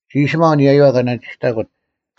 ᒋ ᐊᓴᒪᐤ ᐊᓂᔭᔪᐛ ᑲ ᓇᓂᒋᔅᑕᑯᑦ: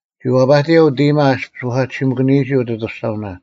ᒋ ᐛᐸᑎᔭᐤ ᐅᑦ ᐃᔨᒪ ᐊᔅᐱᔅ ᓱᐧᑲᑎᓯᒪᑭᓂᔨᒋ ᐅᑦ ᐊᑐᔅᒐᐅᓇ,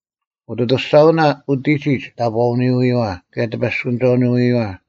ᐅᑦ ᐊᑐᔅᒐᐅᓇ ᐅᑎᒋᒡ ᑕᑈᐅᓄᐎᔨᐛ ᑭᔭ ᑎᐸᔅᑯᓂᒐᐅᓄᔨᐛ: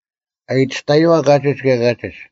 ᐊᔨᑎᔅᑕᔪᐛ ᑲᒋᒡ ᑭᔭ ᑲᒋᒡ,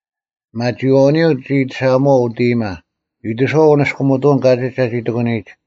ᐱᒪᒋᐃᐛᐅᓂᔪᐤ ᒋ ᐃᑎᓴᐊᒧᐛᐤ ᐅᑦ ᐃᔨᒪ: ᐃᑎᓱᐛᐤ ᐅᓂᔅᑯᒥᑐᐅᓐ ᑲᒋᒡ ᒐᒋ ᑎᒂᓂᔨᒡ: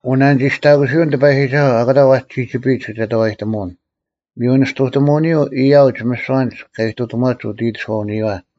ᐅᓇᓂᒋᔅᑕᑯᓯᐅᓐ ᑎᐸᔨᒋᒐᓱᐤ ᐊᑯᑕ ᐛᒋ ᒋᒋᐱᔨᒡ ᑭᒐᑕᐛᔨᑎᒧᐅᓐ: ᒥᔪ ᓂᔅᑐᑎᒧᐅᓂᔪᐤ ᐊᔭᐅᒡ ᒥᓯᐛ ᐊᓐᒡ ᑲ ᐃᑐᑎᒺᒡ ᐅᑦ ᐃᑎᓱᐛᐅᓂᔨᐛ: